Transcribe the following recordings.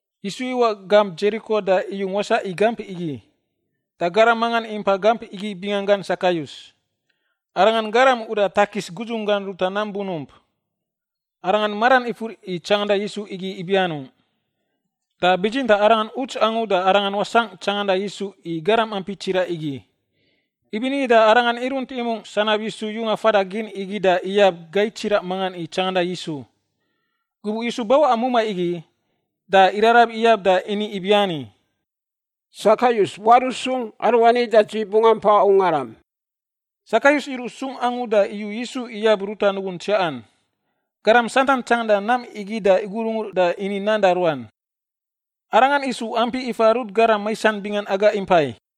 Yisu iwaꞌ gamp Dzeriko da iyung wasaꞌ i gamp igi. Da garam mangan impai gamp igi binganggan Sakayus, arangan garam uda takis gudzunggan ruta nam bunump. Arangan maran ifur i tsanganda Yisu igi ibi anungꞌ, da bitsintaꞌ arangan uts angu da arangan wasangꞌ tsanganda Yisu i garam ampi tsiraꞌ igi. Ibinigi da arangan irunt imungꞌ sanab Yisu yunga fada gin igi da iyab gai tsiraꞌ mangan i tsanganda Yisu. Gubuꞌ Yisu bawaꞌa mumai igi, da irarab iyab da ini ibiani, “Sakayus waruꞌ sung, aruani da dzi bungꞌ ampa ungaram.” Sakayus iruꞌ sung angu da iyu Yisu iyab ruta nugun tsiaꞌan. Garam santan tsanganda nam igi da igurungur da ini nan da ruan, “Arangan isu ampi ifa rut garam maisan bingan aga impai.”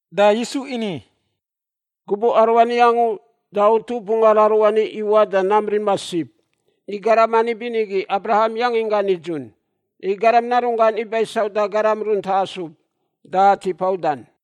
Da Yisu ini, “Gubuꞌ aruani angu da utup ungar aruani iwaꞌ da nam rima sib, i garam ani binigi Abraham yangin gan nidzun. I Garam Narunggan iba i sauda garam runta asub da tipa udan.”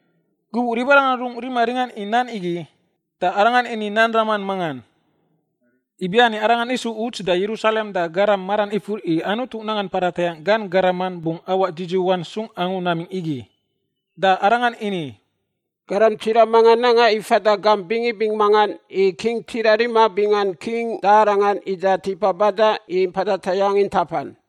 Gubuꞌ ribarangan rungꞌ rima ringan i nan igi, da Arangan ini nan raman mangan, ibiani Arangan isu uts da Yerusalem da garam maran ifur i Anutu nanggan mpada tayangꞌ gan garaman bungꞌ awaꞌ dzidziwan sung angu namingꞌ igi. Da Arangan ini, “Garam tsiraꞌ mangan nanga i fada gamp bingibing mangan i king tsiraꞌ rima bingan king da arangan ida tipa badan i mpada tayangꞌ intapan.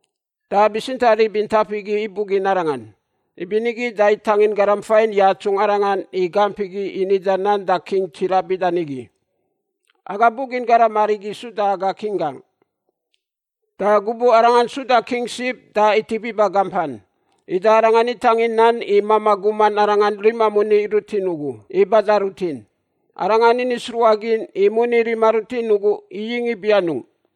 Da bitsintaꞌ rib intap igi ibugin arangan, ibinigi da itangin garam fain yatsungꞌ arangan i gamp igi i nida nan da king tsiraꞌ bida nigi, ‘Aga bugin garam arigi suda aga king gangꞌ!’ “Da gubuꞌ arangan suda king sib da itip iba gampan. Ida arangan itangin nan i mamaꞌ gum arangan rima moni rutin ugu i bada rutin. Arangan ini sruꞌagin i moni rima rutin ugu iyingꞌ ibi anungꞌ.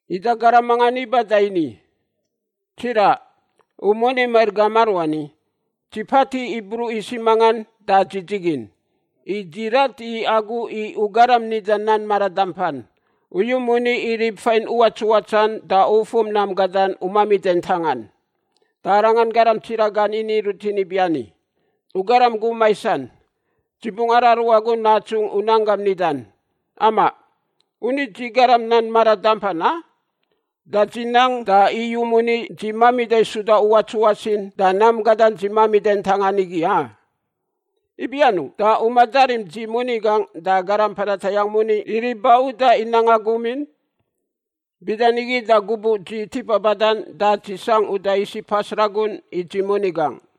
“Ida garam mangan iba da ini, ‘Tsiraꞌ, u moni mair gam aruani. Dzi patiꞌ i bruꞌ isiꞌ mangan da dzi dzigin. I dzi rat i agu i u garam nida nan mara dampan. U yu moni i rib fain uwatsuwatsan da ufum nam gadan u mamida ntangan.’ “Da arangan garam tsiraꞌ gan ini rutin ibiani, ‘U garam gum maisan! Dzi bungꞌ araru agu natsungꞌ u nan gam nidan. Amaꞌ, u ni dzi garam nan mara dampan, a? Da dzi nang da iyu moni dzi mamida suda uwatsuwats in da nam gadan dzi mamida ntangan igi, a? Ibi anungꞌ da u madarim dzi moni gangꞌ da garam mpada tayangꞌ moni i rib ba udan i nanga gum in? Bida nigi da gubuꞌ dzi tipa badan da dzi sangꞌ uda isiꞌ pas ragun i dzi moni gangꞌ.’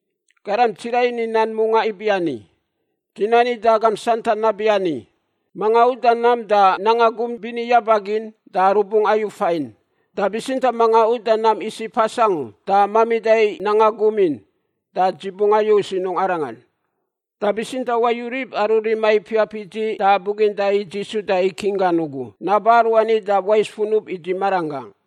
“Garam tsiraꞌ ini nan mungaꞌ ibiani, ‘Dzi nani da agam santan nabiani, manga uda nam da nanga gum bini yaba gin da rubungꞌ ayu fain. Da bitsintaꞌ manga uda nam isiꞌ pas angu da mamida nanga gum in, da dzi bungꞌ ayu sinungꞌ arangan. Da bitsintaꞌ wayu rib aru rima ipiap i dzi da buginda i dzi suda i king gan ugu naba aruani da wais funub i dzi maranggangꞌ.’”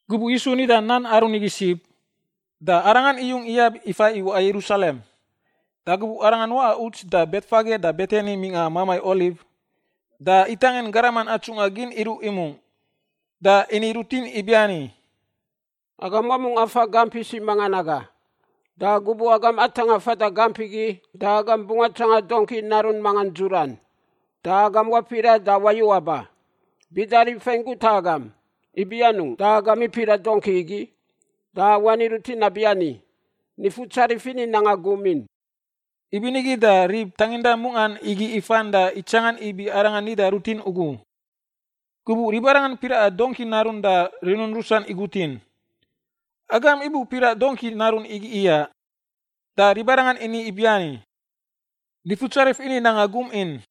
Gubuꞌ Yisu nida nan aru nigi sib, da Arangan iyung iyab ifa i waꞌa Yerusalem. Da gubuꞌ Arangan waꞌa uts da Betfage da Betani mingꞌa Mamai Oliv, da itangin garaman atsungꞌa gin iruꞌ imungꞌ, da ini rutin ibiani, “Agam wamungꞌ afa gamp isiꞌ mangan naga, da gubuꞌ agam atangꞌa fada gamp igi da agam bungꞌ atsanga dongki narun mangan dzuran, da agam wapiraꞌ da wayu aba. Bida rib fain guta agam, ‘Ibi anungꞌ da agam ipiraꞌ dongki igi?’ Da wani rutin nabiani, ‘Nifutsarif ini nanga gum in.’” Ibinigi da rib tanginda mungꞌan igi ifan da itsanga ibi Arangan nida rutin ugu. Gubuꞌ ribarangan piraꞌa dongki narun da rinun rusan igutin, “Agam ibu piraꞌ dongki narun igi iyaꞌ?” Da ribarangan ini ibiani, “Nifutsarif ini nanga gum in.”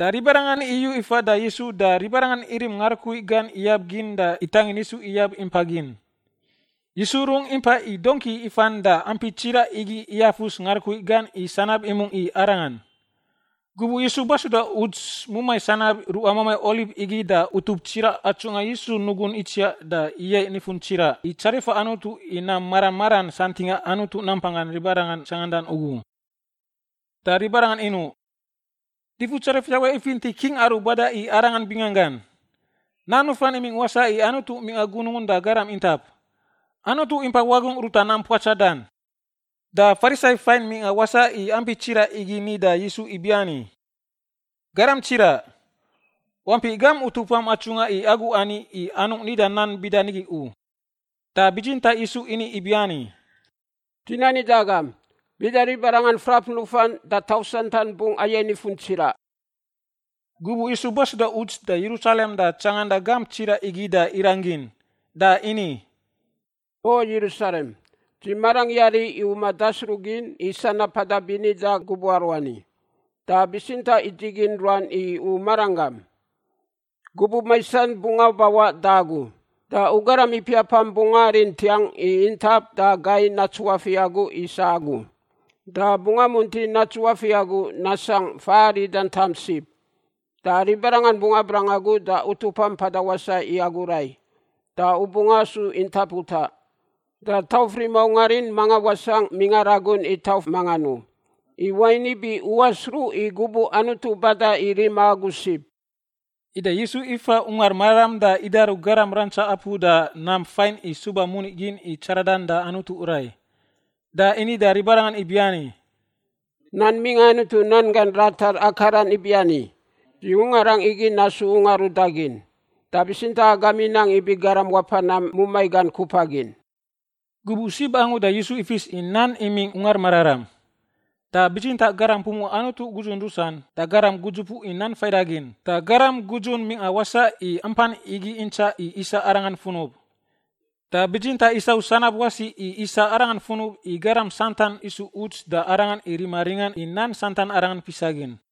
Da ribarangan iyu ifa da Yisu da ribarangan irim ngarukui gan iyab gin da itangin Yisu iyab impa gin. Yisu rungꞌ impai i dongki ifan da ampi tsiraꞌ igi iyafus ngarukui gan i sanab imungꞌ i Arangan. Gubuꞌ Yisu basuda uts mumai sanab ruꞌa Mamai Oliv igi da utup tsiraꞌ atsungꞌa Yisu nugun itsiaꞌ da iyaiꞌ nifun tsiraꞌ i tsarifa Anutu i nam mara maran santingꞌa Anutu nampanggan ribarangan tsangandan ugu. Da ribarangan inuꞌ, “Nifutsarif ifinti king aru bada i Arangan binganggan! Nan nufan imingꞌ wasaꞌ i Anutu mingꞌa Gunungun da garam intap! Anutu impa wagungꞌ ruta nam puatsadan!” Da Farisai fain mingꞌa wasaꞌ i ampi tsiraꞌ igi ni da Yisu ibiani, “Garam tsiraꞌ, wampiꞌ gam utupam atsungꞌa i agu ani i anungꞌ nida nan bida nigi u.” Da bitsintaꞌ Yisu ini ibiani, “Dzi nani da agam, bida ribarangan frap nufan da tauf santan bungꞌ ayaiꞌ nifun tsiraꞌ.” Gubuꞌ Yisu basuda uts da Yerusalem da tsanganda gamp tsiraꞌ igi da irang gin. Da ini, “O Yerusalem, dzi marangꞌ yari i u madasruꞌgin i sanab mpada bini da gubuꞌ aruani, da bitsintaꞌ idzigin ruan i u maranggam. Gubuꞌ maisan bungꞌ abawaꞌ da agu da u garam ipiapam bungꞌ arim ntiang i intap da gai natsuafiꞌ agu i isa agu. Da bungꞌ amunti natsuafiꞌ agu nasangꞌ fa arida tam sib. Da ribarangan bungꞌ abrang agu da utupam mpada wasaꞌ i agu rai. Da u bungꞌ asu intap utaꞌ, da tauf rima ungar in manga wasangꞌ mingꞌa ragun i tauf mangan u. I wain ibi u wasruꞌ i gubuꞌ Anutu bada i rima agu sib.” Ida Yisu ifa Ungar Mararam da idaru garam rantsa apu da nam fain i suba moni gin i tsaradan da Anutu rai. Da ini da ribarangan ibiani, “Nan mingꞌa Anutu nan gan ratar akaran ibiani, ‘Dzi ungarangꞌ igi nasu ungar udagin.’ Da bitsintaꞌ agam inang ibi garam wapa nam mumai gan kupa gin!” Gubuꞌ sib angu da Yisu ifis i nan imingꞌ Ungar Mararam. Da bitsintaꞌ garam pumuꞌa Anutu gudzun rusan, da garam gudzupuꞌ i nan faidagin, da garam gudzun mingꞌa wasaꞌ i ampan igi intsaꞌ i isa Arangan funub. Da bitsintaꞌ isau sanab wasi i isa Arangan funub i garam santan isu uts da Arangan i rima ringan i nan santan Arangan fisagin.